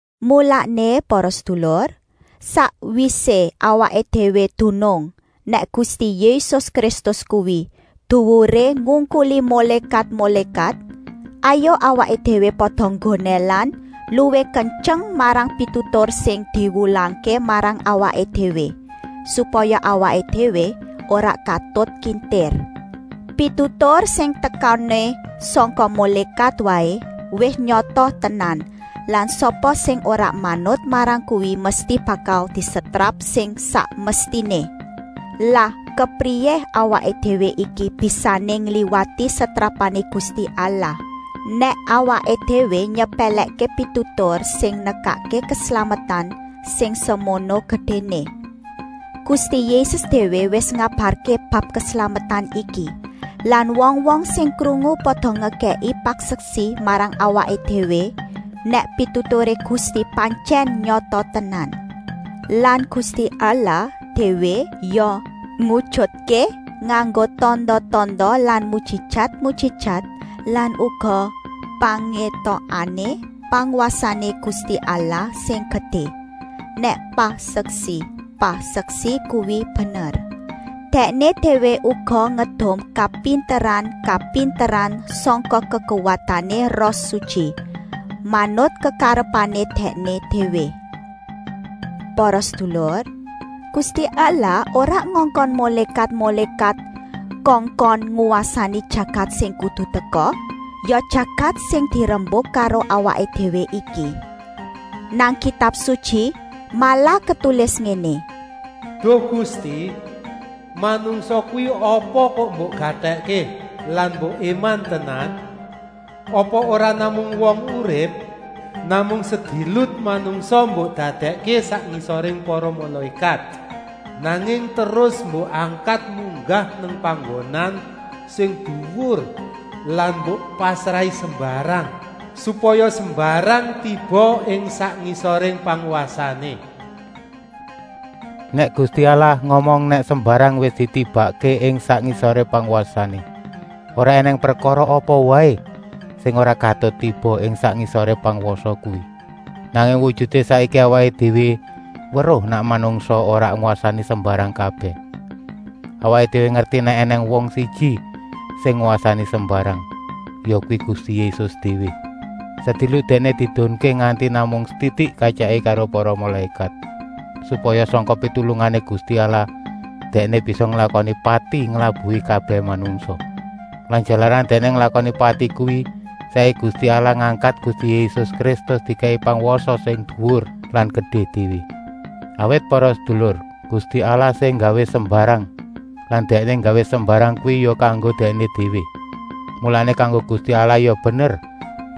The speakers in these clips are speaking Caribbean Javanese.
Mulané para sedulur, sakwisé awaké déwé dunung nèk Gusti Yésus Kristus kuwi duwuré ngungkuli mulékat-mulékat, hayuk awaké déwé pada gondèlan luwih kentyeng marang pitutur sing diwulangké marang awaké déwé, supaya awaké déwé ora katut kintir. Pitutur sing tekané sangka mulékat waé wis nyata tenan lan sapa sing ora manut marang kuwi mesti bakal disetrap sing sak mestiné. Lah kepriyé awaké déwé iki bisané ngliwati setrapané Gusti Allah, nèk awaké déwé nyepèlèkké pitutur sing nekakké keslametan sing semono gedéné. Gusti Yésus déwé wis ngabarké bab keslametan iki lan wong-wong sing krungu pada ngekèki paseksi marang awaké déwé nèk pituturé Gusti pantyèn nyata tenan. Lan Gusti Allah déwé ya ngujutké nganggo tanda-tanda lan mujijat-mujijat lan uga pangétokané pangwasané Gusti Allah sing gedé, nèk paseksi-paseksi kuwi bener. Dèkné déwé uga ngedum kapinteran-kapinteran sangka kekuwatané Roh Sutyi, manut kekarepané Dèkné déwé. Para sedulur, Gusti Allah ora ngongkon mulékat-mulékat kongkon ngwasani jagat sing kudu teka, ya jagat sing dirembuk karo awaké déwé iki. Nang Kitab Sutyi malah ketulis ngéné: “Duh Gusti, manungsa kuwi apa kok mbok gatèkké lan mbok éman tenan? Apa ora namung wong urip? Namung sedilut manungsa mbok dadèkké sak ngisoré para mulékat, nanging terus mbok angkat munggah nang panggonan sing duwur lan mbok pasrahi sembarang, supaya sembarang tiba ing sak ngisoré pangwasané.” Nèk Gusti Allah ngomong nèk “sembarang wis ditibakké ing sak ngisoré pangwasané”, ora ènèng prekara apa waé sing ora katut tiba ing sak ngisoré pangwasa kuwi. Nanging wujuté saiki awaké déwé weruh nèk manungsa ora ngwasani sembarang kabèh. Awaké déwé ngerti nèk ènèng wong siji sing ngwasani sembarang, yakuwi Gusti Yésus déwé. Sedilut Dèkné diedunké nganti namung setitik katyèké karo para mulékat, supaya sangka pitulungané Gusti Allah Dèkné bisa nglakoni pati nglabuhi kabèh manungsa. Lan jalaran Dèkné nglakoni pati kuwi, saiki Gusti Allah ngangkat Gusti Yésus Kristus, dikèki pangwasa sing duwur lan gedé déwé. Awit para sedulur, Gusti Allah sing nggawé sembarang lan Dèkné nggawé sembarang kuwi ya kanggo Dèkné déwé. Mulané kanggo Gusti Allah ya bener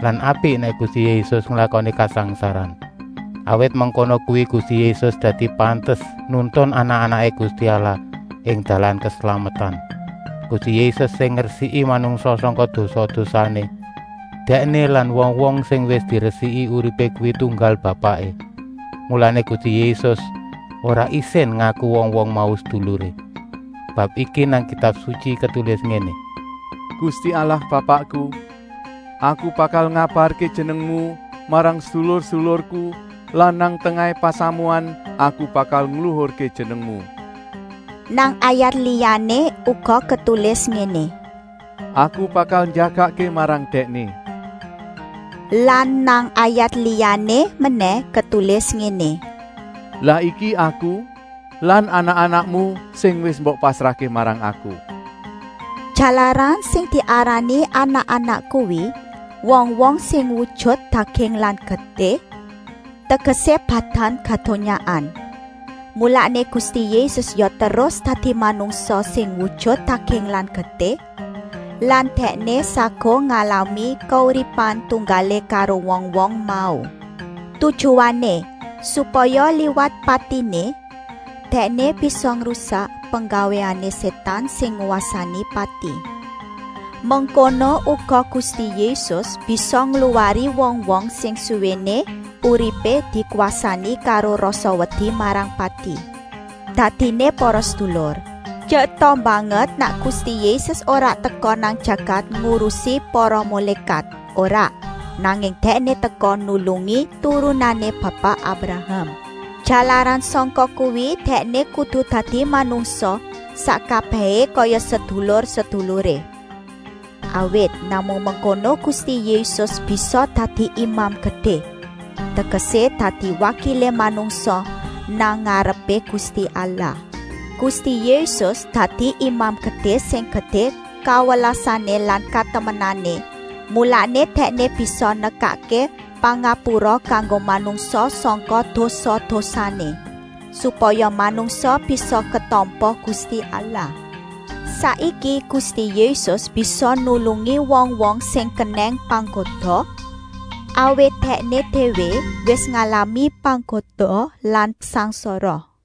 lan apik nèk Gusti Yésus nglakoni kasangsaran. Awit mengkono kuwi Gusti Yésus dadi pantes nuntun anak-anaké Gusti Allah ing dalan keslametan. Gusti Yésus sing ngresiki manungsa sangka dosa-dosané. Dèkné lan wong-wong sing wis diresiki uripé kuwi tunggal bapaké. Mulané Gusti Yésus ora isin ngaku wong-wong mau seduluré. Bab iki nang Kitab Sutyi ketulis ngéné: “Gusti Allah Bapakku, Aku bakal ngabarké Jenengmu marang sedulur-sedulurku lan nang tengahé pasamuan Aku bakal ngluhurké Jenengmu!” Nang ayat liyané uga ketulis ngéné: “Aku bakal njagakké marang Dèkné.” Lan nang ayat liyané menèh ketulis ngéné: “Lah iki Aku lan anak-anakmu sing wis mbok pasrahké marang Aku.” Jalaran sing diarani anak-anak kuwi wong-wong sing wujut daging lan getih, tegesé badan kadonyaan, mulané Gusti Yésus ya terus dadi manungsa sing wujut daging lan getih lan Dèkné saguh ngalami kauripan tunggalé karo wong-wong mau. Tujuané, supaya liwat patiné, Dèkné bisa ngrusak penggawéané Sétan sing ngwasani pati. Mengkono uga Gusti Yésus bisa ngluwari wong-wong sing suwéné uripé dikwasani karo rasa wedi marang pati. Dadiné para sedulur, tyeta banget nèk Gusti Yésus ora teka nang jagat ngurusi para mulékat, ora, nanging Dèkné teka nulungi turunané Bapa Abraham. Jalaran sangka kuwi Dèkné kudu dadi manungsa sak kabèhé kaya sedulur-seduluré. Awit namung mengkono kuwi Gusti Yésus bisa dadi Imam Gedé, tegesé dadi wakilé manungsa nang ngarepé Gusti Allah. Gusti Yésus dadi Imam Gedé sing gedé kawelasané lan katemenané, mulané Dèkné bisa nekakké pangapura kanggo manungsa sangka dosa-dosané, supaya manungsa bisa ketampa Gusti Allah. Saiki Gusti Yésus bisa nulungi wong-wong sing kenèng panggoda, awit Dèkné déwé wis ngalami panggoda lan sangsara.